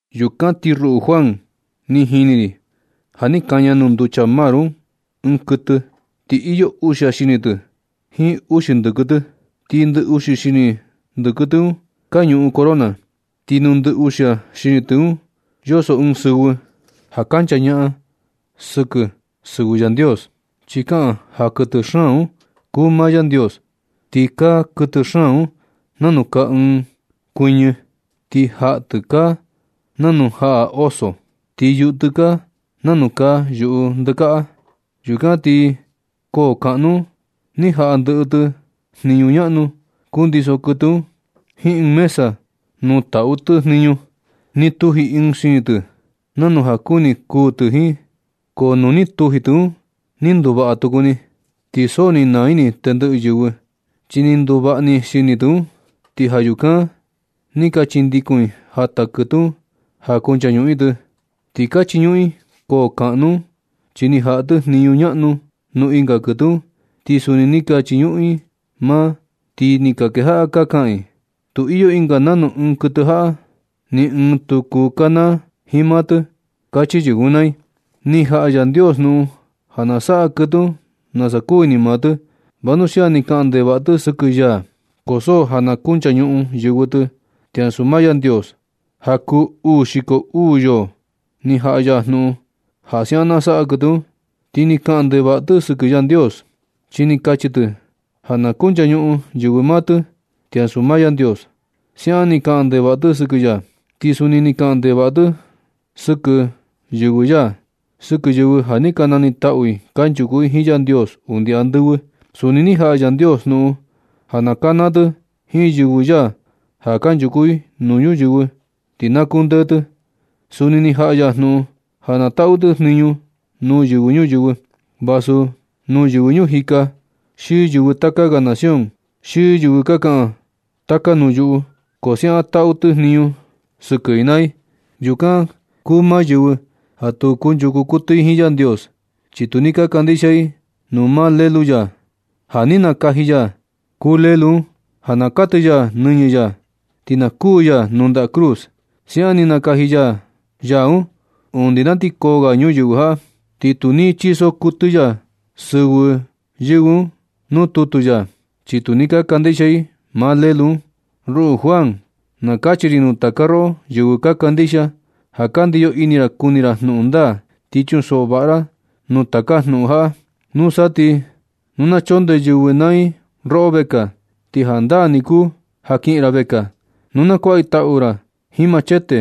Yukan ti ruꞌu Juan, ni jini ri ja ni kaña nuu nducha mar un ɨɨn kuɨtɨ. Ti iyo uxia xini tɨ jiin uxi ndɨkɨ tɨ. Ti ndɨ uxi xini ndɨkɨ tɨ un ka ñuꞌun corona. Ti nuu ndɨ uxia xini tɨ un yoso ɨɨn sɨvɨ ja kanchañaꞌan sɨkɨ sɨvɨ Yandios, chi kaꞌan ja kuɨtɨ xaan un kuu maa Yandios. Ti kaa kuɨtɨ xaan un nanu kaa ɨɨn kuɨ́ñɨ. Ti jaꞌa tɨ kaa nanu jaꞌa oso, ti yuꞌu tɨ kaa nanu kaa yuꞌu ndɨkaꞌa. Yukan ti koo kaꞌnu un ni jaꞌa ndɨꞌɨ tɨ jniñu ñaꞌnu kundiso kuɨtɨ un, jiin ɨɨn mesa nuu taꞌu tɨ jniñu. Ni tuji ɨɨn xini tɨ. Nanu ja kuni kuu tɨ jiin. Ko nuu ni tuji tɨ un ni nduvaꞌa tuku ni. Ti so ni naa ini tendɨꞌɨ yɨvɨ, chi ni nduvaꞌa ni xini tɨ un, ti ja yukan ni ka chindikun i jata kuɨtɨ un ja kunchañuꞌun i tɨ. Ni ka chiñuꞌun i koo kaꞌnu un, chi ni jaꞌa tɨ jniñu ñaꞌnu nuu ɨnga kuɨtɨ un, ti suni ni ka chiñuꞌun i maa. Ti ni ka kejaꞌa ka kaꞌan i: ―Tu iyo ɨnga nanu ɨɨn kuɨtɨ jaꞌa. Ni ɨɨn tu kuu kanaa jiin maa tɨ ―kachi yɨvɨ un naa i. Ni jaꞌa Yandios jnuꞌun ja na saꞌa kuɨtɨ un nasa kuu ini maa tɨ. Vanuxia ni kaꞌan ndevaꞌa tɨ sɨkɨ ya, so ja na kunchañuꞌun yɨvɨ tɨ ti ansu maa Yandios. Ja kuu uu xiko uu yoo ni jaꞌa ya jnuꞌun ja siaꞌan na saꞌa kuɨtɨ un. Ti ni kaꞌan ndevaꞌa tɨ sɨkɨ Yandios, chi ni kachi tɨ ja na kunchañuꞌun yɨvɨ maa tɨ ti ansu maa Yandios. Siaꞌan ni kaꞌan ndevaꞌa tɨ sɨkɨ ya, ti suni ni kaꞌan ndevaꞌa tɨ sɨkɨ yɨvɨ ya, sɨkɨ yɨvɨ ja ni ka ni taꞌu i kanchuku i jiin Yandios undi andɨvɨ. Suni ni jaꞌa Yandios jnuꞌun ja na kanaa tɨ jiin yɨvɨ ya ja kanchuku i nuu ñuyɨvɨ ti na kundee tɨ. Suni ni jaꞌa ya jnuꞌun ja na taꞌu tɨ jniñu nuu yɨvɨ ñuyɨvɨ, vasu nuu yɨvɨ ñuu jika, xi yɨvɨ taka ga nación, xi yɨvɨ ka kaꞌan taka nuu yuꞌu, ko siaꞌan taꞌu tɨ jniñu sɨkɨ i naa i. Yukan kuu maa yɨvɨ ja tu kunchuku kuɨtɨ i jiin Yandios, chi tu ni kandixia i nuu maa Lelu ya. Ja ni nakaji ya ya kuu Lulu un, ja na katɨ ya nɨñɨ ya, ti na kuū ya nuu ndaꞌa cruz. Siaꞌan ni nakaji ya ya un undi na sa ti koo ga ñuyɨvɨ jaꞌa. Ti tu ni chiso kuɨtɨ ya sɨvɨ yɨvɨ un nuu tutu ya, chi tu ni ka kandixia i maa Lelu un. Ruꞌu Juan, na kachi ri nuu taka roꞌo yɨvɨ ka kandixia, ja ka ndiyo ini ra kuni ra jnuꞌun ndaa. Ti chunsoꞌo vaꞌa naa ra nuu taka jnuꞌun jaꞌa. Nusa ti nu na chondee yɨvɨ naa i roꞌo vekaa, ti jandaa ni kuu ja kiꞌin ra vekaa. Nu na kuaꞌa i tau ra jiin machete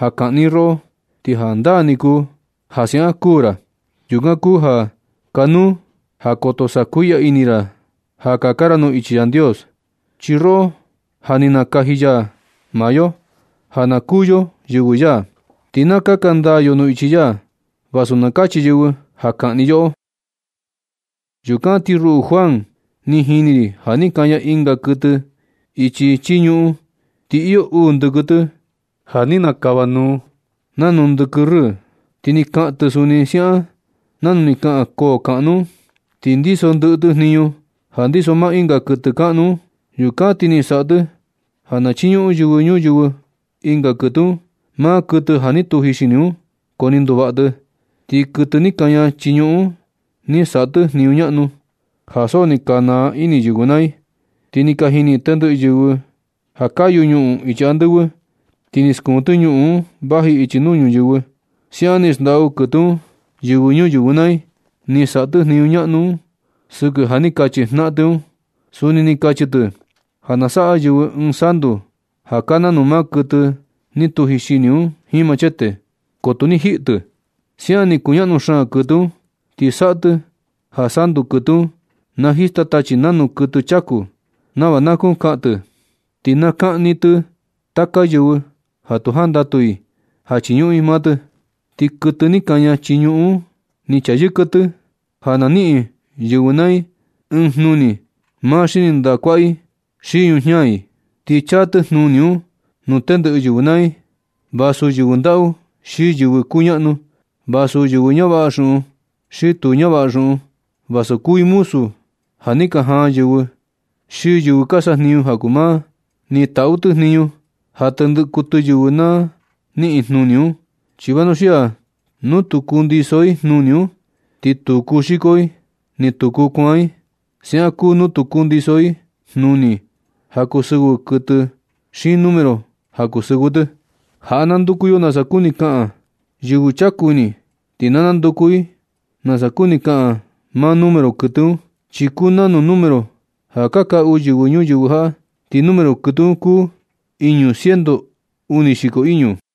ja kaꞌni i roꞌo, ti jandaa ni kuu ja siaꞌan kuu ra. Yukan kuu ja kanuu ja koto sakuiꞌya ra ini ra ja kaka ra nuu ichi Yandios. Chi yoꞌo ja ni nakaji ya maa yo ja na kuū yo yɨvɨ ya, ti na kaka ndaa yo nuu ichi ya, vasu na kachi yɨvɨ ja kaꞌni i yoꞌo. Yukan ti ruꞌu Juan, ni jini ri ja ni kaña ɨnga kuɨtɨ ichi chii ñuꞌun. Ti iyo uu ndɨkɨ tɨ ja ni nakava nuu nanu ndɨkɨ rɨɨ. Ti ni kaꞌan tɨ suni siaꞌan nanu ni kaꞌan koo kaꞌnu un. Ni ndiso ndɨꞌɨ tɨ jniñu ja ndiso maa ɨnga kuɨtɨ kaꞌnu un. Yukan ti ni saꞌa tɨ ja na chiñuꞌun yɨvɨ ñuyɨvɨ ɨnga kuɨtɨ un, maa kuɨtɨ ja ni tuji xini un, ko ni nduvaꞌa tɨ. Ti kuɨtɨ ni kaña chii ñuꞌun un ni saꞌa tɨ jniñu ñaꞌnu, ja so ni ka naa ini yɨvɨ naa i. Ti ni ka jini tendɨꞌɨ yɨvɨ un ja kayu ñuꞌun ichi andɨvɨ, ti ni skuun tɨ ñuꞌun un vaji ichi nuu ñuyɨvɨ. Siaꞌan ni xndaꞌu kuɨtɨ un yɨvɨ ñuyɨvɨ naa i, ja ni saꞌa tɨ jniñu ñaꞌnu un sɨkɨ ja ni kachi jnaꞌan tɨ un. Suni ni kachi tɨ ja na saꞌa yɨvɨ ɨɨn santu ja kaa nanu maa kuɨtɨ ni tuji xini un jiin machete, ko tu ni jiꞌi tɨ. Siaꞌan ni kuñaꞌnu xaan kuɨtɨ un. Ti saꞌa tɨ ja santu kuɨtɨ un na jista tachi nanu kuɨtɨ chaku nava na kuu kaꞌan tɨ, ti na kaꞌni tɨ taka yɨvɨ ja tu jandatu i ja chiñuꞌun i maa tɨ. Ti kuɨtɨ ni kaña chii ñuꞌun un ni chayɨka tɨ ja na niꞌin yɨvɨ naa i ɨɨn jnuni maa xini ndaꞌa kuaꞌa i xi yujiña i. Ni chaa tɨ jnuni un nuu tendɨꞌɨ yɨvɨ naa i, vasu yɨvɨ ndaꞌu xi yɨvɨ kuñaꞌnu, vasu yɨvɨ ñavaꞌa xuꞌun xi yɨvɨ tu ñavaꞌa xuꞌun, vasu kuu i muzu ja ni ka jaan yɨvɨ xi yɨvɨ ja ka sajniñu ja kuu maa. Ni taꞌu tɨ jniñu ja tendɨꞌɨ kuɨtɨ yɨvɨ na niꞌin jnuni un. Chi vanuxia nu tu kundiso i jnuni un, ti tu kuu xiko i ni tu kuu kuan i. Siaꞌan kuu nu tu kundiso i jnuni ja kuu sɨvɨ kuɨtɨ xiin número ja kuu sɨvɨ tɨ. Jaꞌa na nanduku yo nasa kuni kaꞌan un. Yɨvɨ chaku ini ti na nanduku i nasa kuni kaꞌan maa número kuɨtɨ un, chi kuu nanu número ja ka kaꞌu yɨvɨ ñuyɨvɨ jaꞌa. Ti número kuɨtɨ un kuu iñu ciento uni xiko iñu.